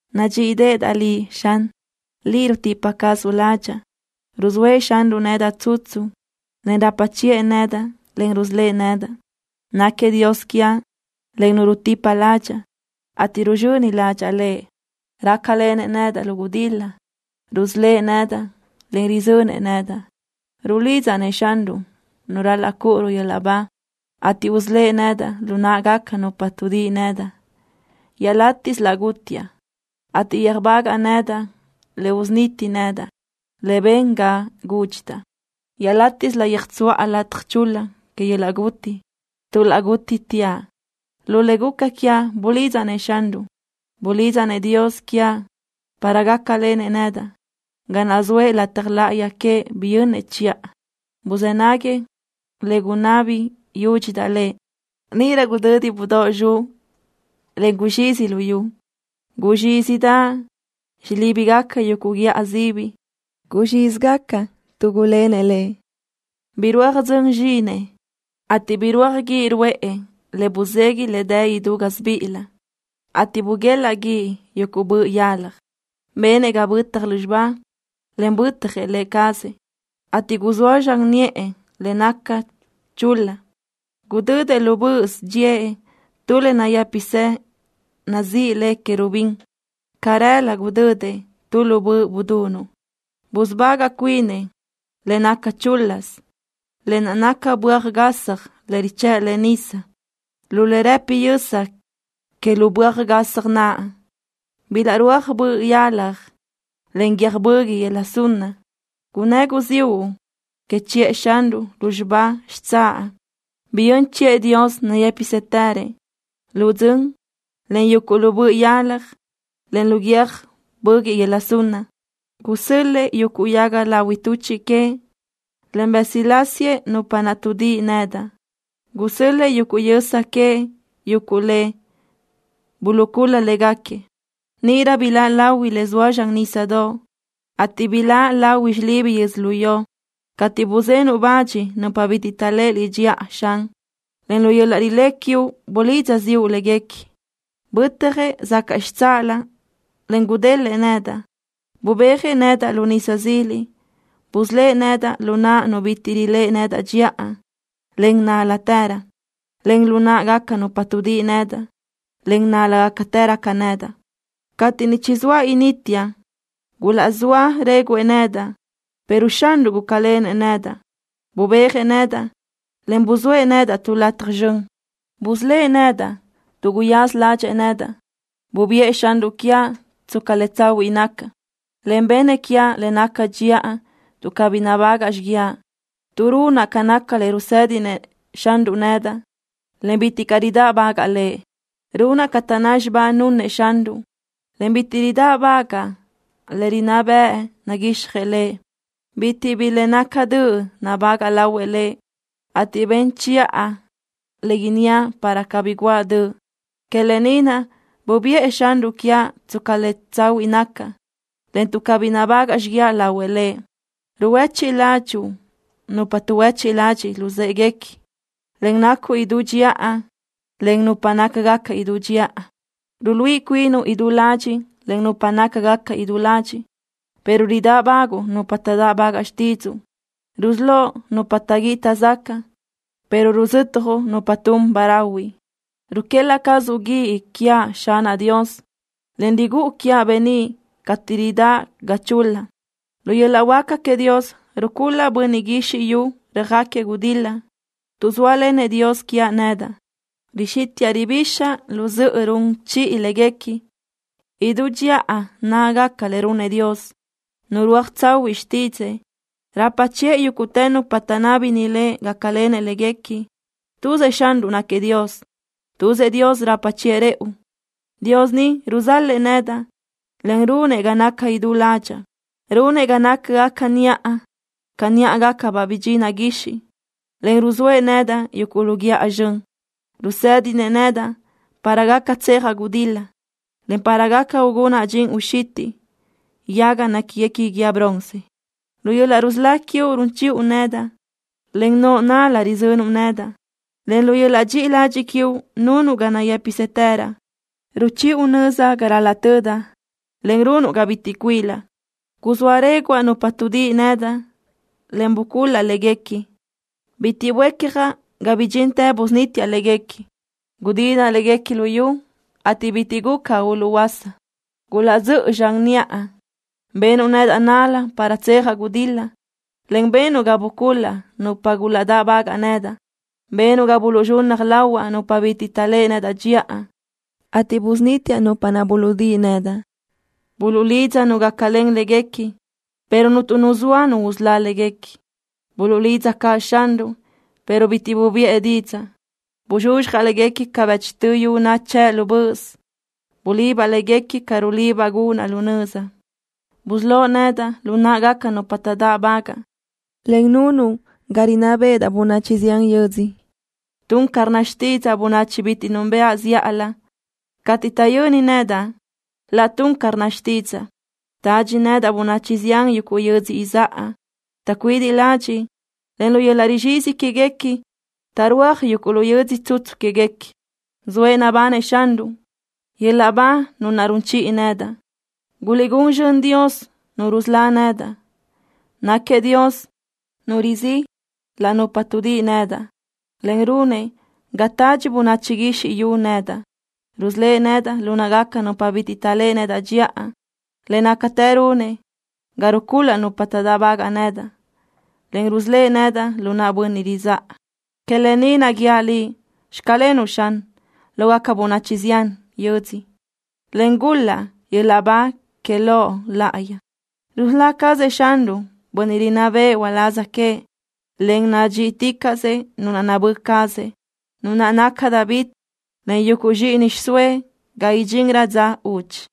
¡Nadxíʼideʼedaʼ Liʼ, Xan! ¡Liʼ rutipa cazuʼ ládxaʼa! Ruzóëʼ Xanruʼ nedaʼ tsutsu, en rapa chiʼë nedaʼ, en rusölë́ʼ nedaʼ. Náquiëʼ Dios quiaʼ, en Nu rutipa ládxaʼa, ateʼ ruzxöni ládxaʼa Lëʼ. Rácalenëʼ nedaʼ lu gudil-la: Rusölë́ʼ nedaʼ, en rizönëʼ nedaʼ. Rulidzaʼ-nëʼ Xanruʼ Nu ral-laʼ cúʼuruʼ yöl-laʼ ba, ateʼ usölë́ʼ nedaʼ lu náʼagaca nupa tuʼdíʼi nedaʼ. Iaʼlátiʼsö laʼ gútiaʼ, ateʼ yöjbagaʼ nedaʼ le usuniti nedaʼ, le ben ga gúdxidaʼ. Iaʼlátiʼsö laʼ yöjtsuʼa lataj chul-la que yöl-laʼ guti, tuʼ laʼ gútitiaʼ. Lu le guca quiaʼ bulidzaʼ-nëʼ Xanruʼ. Bulidzaʼ-nëʼ Dios quiaʼ para gácalenëʼ nedaʼ. Ga naʼ zoëʼ lataj láʼayi queëʼ biyönnëʼ chiʼa. Buzë́ naguëʼ le gunabi yúdxidaʼ Lëʼ. Níʼirö gudödi budóʼ zxuʼ, en guzxizi luyú. Guzxízidaʼ xilíbigaca yuguʼ guíʼa sibi. Guzxízigaca tuʼ gulénëʼ Lëʼ. Birúaj dzön zxínëʼë, ateʼ birúaj guíʼ ruʼë le buzegui le dë idú gásibiʼilëʼ, ateʼ buguelaʼ guíʼ yuguʼ boʼ yalaj. Benëʼ ga bötaj lúzxiba, en bö́tajëʼ Lë cazëʼ, ateʼ guzóa zxan niʼë le naca chul-la. Gudödëʼ lu böʼös dxíëʼ tu le nayë́pisë nazíʼi le querubín. Carelö gudödëʼ tu lu böʼ budunuʼ. Busubagaʼ cuinëʼ le naca chúl-lasö. Lë naʼ naca böaj gasaj le richë́ʼlëʼe nisa. Lu le rëpi yösa queëʼ lu böaj gasaj naʼ bilaʼrúaj boʼ yalaj, en guiö́j böguiʼ yöla sunna. Gunnë́ guziúʼ que chiʼë Xanruʼ lúzxiba xitsáʼ. Biyö́n chiʼë Dios nayë́pisëtërëʼ, lu dzön, en yuguʼ lu boʼ yalaj, en lu guiö́j böguiʼ yöla sunna. Gusö́l-lëʼë yuguʼ yaga lahui tuchiʼ queëʼ, en bësilásiëʼ nupa naʼ tuʼdíʼi nedaʼ. Gusö́l-lëʼë yuguʼ yösa queëʼ yuguʼ le buluʼcul-la léguequi. Níʼirö biláʼ lahui le zoa zxan nísadoʼ, ateʼ biláʼ lahui xilibi yödzölió, cateʼ buzenuʼ bach nupa bitiʼ taʼléʼe Liʼ dxiʼa, Xan, en lu yöl-laʼ rilé quiuʼ bulidza ziʼu léguequi. Bötjëʼ zacaʼ xitsáʼalö, en gudélëʼë nedaʼ. Bubéajëʼ nedaʼ lu nisa zili. Busölë́ʼ nedaʼ lu naʼ nu bitiʼ riléʼe nedaʼ dxiʼa, en nál-latërö, encaʼ lu náʼagaca nupa tuʼdíʼi nedaʼ, en nál-lágacatërö ca nedaʼ. Cateʼ niʼ chizóa inítiaʼ gulaʼzóa réguʼë nedaʼ, pero Xanruʼ gúcalenëʼ nedaʼ. Bubéajëʼ nedaʼ, en buzóëʼ nedaʼ tu lu lataj zxön. Busölë́ʼ nedaʼ tuʼ guyaza ládxëʼë nedaʼ. Bubiʼë Xanruʼ quiaʼ tsca le tsahuiʼ nacaʼ, en benëʼ quiaʼ le naca dxiʼa tuʼ cabí nabágaʼa xiguiaʼ, tuʼ runaʼ ca naca le rusë́dinëʼ Xanruʼ nedaʼ, en bitiʼ caʼ ridáʼbagaʼa Lëʼ. Runaʼ ca taʼnná xibá nunëʼ Xanruʼ, en bitiʼ ridáʼbagaʼa le rinná bëʼ naguixjëʼ Lëʼ. Bitiʼ bi le naca döʼ nabágaʼa lahuëʼ Lëʼ, ateʼ ben chiʼa le inníaʼ para cabí guʼa döʼ. Que lë ni naʼ bubiʼë Xanruʼ quiaʼ tsca le tsahuiʼ nacaʼ, en tuʼ cabí nabágaʼa xiguiaʼ lahuëʼ Lëʼ. Ruhuéchiʼ ládxuʼu nupa tuʼhuechiʼ ladxiʼ luzë́ʼeguequi, en nacuʼ idú dxiʼa len nupa nácagaca idú dxiʼa. Ruluíʼi cuinuʼ idú ladxiʼ len nupa nácagaca idú ladxiʼ, pero ridáʼbaguʼu nupa taʼdáʼbagaʼ xtídzuʼu. Rusölóʼ nupa taʼguíʼi taʼzacaʼ, pero ruzötjuʼ nupa tun ba rahui. Ruquélaʼ cazuʼ guíʼ quiaʼ, Xanaʼ Dios, en rigúʼu quiaʼ beníʼ cateʼ ridáʼ ga chul-la. Lu yöl-laʼ huáca queëʼ Dios rucul-laʼ bönniʼ guizxi yu röjáquiëʼ gudil-la. Tuʼ zóalenëʼ Dios quiaʼ nedaʼ, rixítiʼa ribixaʼ lu zöʼö run chiʼi léguequi. Idú dxiʼa nácagaca le runëʼ Dios. Nurúaj tsahuiʼ xtídzëʼë. Rapa chiʼë yúguʼtë nupa taʼnábini Lëʼ gácalenëʼ léguequi. ¡Tuzëʼ Xanruʼ náquiëʼ Dios! ¡Tuzëʼ Dios rapa chiʼë rëʼu! Dios ni ruzalëʼ nedaʼ, en runëʼ ga nacaʼ idú ládxaʼa. Runëʼ ga nácagaca niʼa ca níʼagacabaʼ bidxinaʼ guixiʼ, en ruzóëʼ nedaʼ yuguʼ lu guíʼa zxön. Rusédinëʼ nedaʼ para gaca tsejaʼ gudil-la, en para gaca ugunaʼ dxin uxitiʼ yaga néquini guíë bronce. Lu yöl-laʼ rusölá quiuʼ run chiʼu nedaʼ. Len noʼo nál-la rizönuʼ nedaʼ, en lu yöl-laʼ dxiʼi ladxiʼ quiuʼ nunuʼ ga nayë́pisëtëraʼ. Ruchiʼu nöza ga ral-laʼ tödaʼ, en runuʼ ga bitiʼ cuilaʼ. Guzóa réguʼa nupa tuʼdíʼi nedaʼ, en bucul-laʼ léguequi. Bitiʼ buécjaʼ ga bidxintë busunítiaʼ léguequi. Gudinaʼ léguequi luyú, ateʼ bitiʼ guca uluʼhuöása. Gulaʼdzö́ʼö zxan niʼa. Benuʼ nedaʼ nál-la para tsejaʼ gudil-la, en benuʼ ga bucul-laʼ nupa gulaʼdáʼbagaʼ nedaʼ. Benuʼ ga buluʼzxunnaj lahuaʼ nupa bitiʼ taʼléʼe nedaʼ dxiʼa, ateʼ busunítiaʼ nupa naʼ buluʼdíʼi nedaʼ. Buluʼlidza nu gácalen léguequi, pero cuntu nu zoa usölá léguequi. Buluʼlidza caʼ Xanruʼ, pero bitiʼ bubiʼë didzaʼ. Buzxuzxjaʼ léguequi ca bëchtö yu nachë́ʼ lu böʼös. Bulibaʼ léguequi ca rulibaʼ gunaʼ laʼ nöza. Busölóʼ nedaʼ lu náʼagaca nupa taʼdáʼbagaʼ, en nunuʼ ga rinná béʼedaʼ bönachi zián yödzö. Tun ca rnna xtídzaʼa bönachi bitiʼ núnbëʼa zíʼalö. Cateʼ taʼyöni nedaʼ, laʼ tun ca rnna xtídzaʼa. Tadxi nedaʼ bönachi zián yuguʼ yödzö izáʼa. Taʼcuidiʼ ladxiʼ, en lu yöl-laʼ rizxizi quéguequi taʼrúaj yuguʼ lu yödzö tsutsu quéguequi. ¡Zoëʼ nabanëʼ Xanruʼ! ¡Yöl-laʼ ba Nu naʼ run chiʼi nedaʼ! ¡Guliʼgún zxön Dios Nu rusölá nedaʼ! Náquiëʼ Dios Nu rizíʼ la nupa tuʼdíʼi nedaʼ, en runëʼ ga tadxi bönachi guizxi yu nedaʼ. Rusölë́ʼ nedaʼ lu náʼagaca nupa bitiʼ taʼléʼe nedaʼ dxiʼa. Le nácatë runëʼ ga rucul-laʼ nupa taʼdáʼbagaʼ nedaʼ, en rusölë́ʼ nedaʼ lu naʼ bönniʼ ridzáʼa. Que lë ni naʼ guíaʼ Liʼ: Xclenuʼ Xan, lógaca bönachi zián yödzö, en gul-laʼ yöl-laʼ ba que Loʼ Laʼayi. Rusölá cazëʼ Xanruʼ bönniʼ rinná bëʼë uláz queëʼ, en nadxíʼiticaʼsëʼ nu naʼ nabö́ cazëʼ, nu naʼ naca David, en yuguʼ zxíʼini xiʼsóëʼ ga idxinrö dza udxi.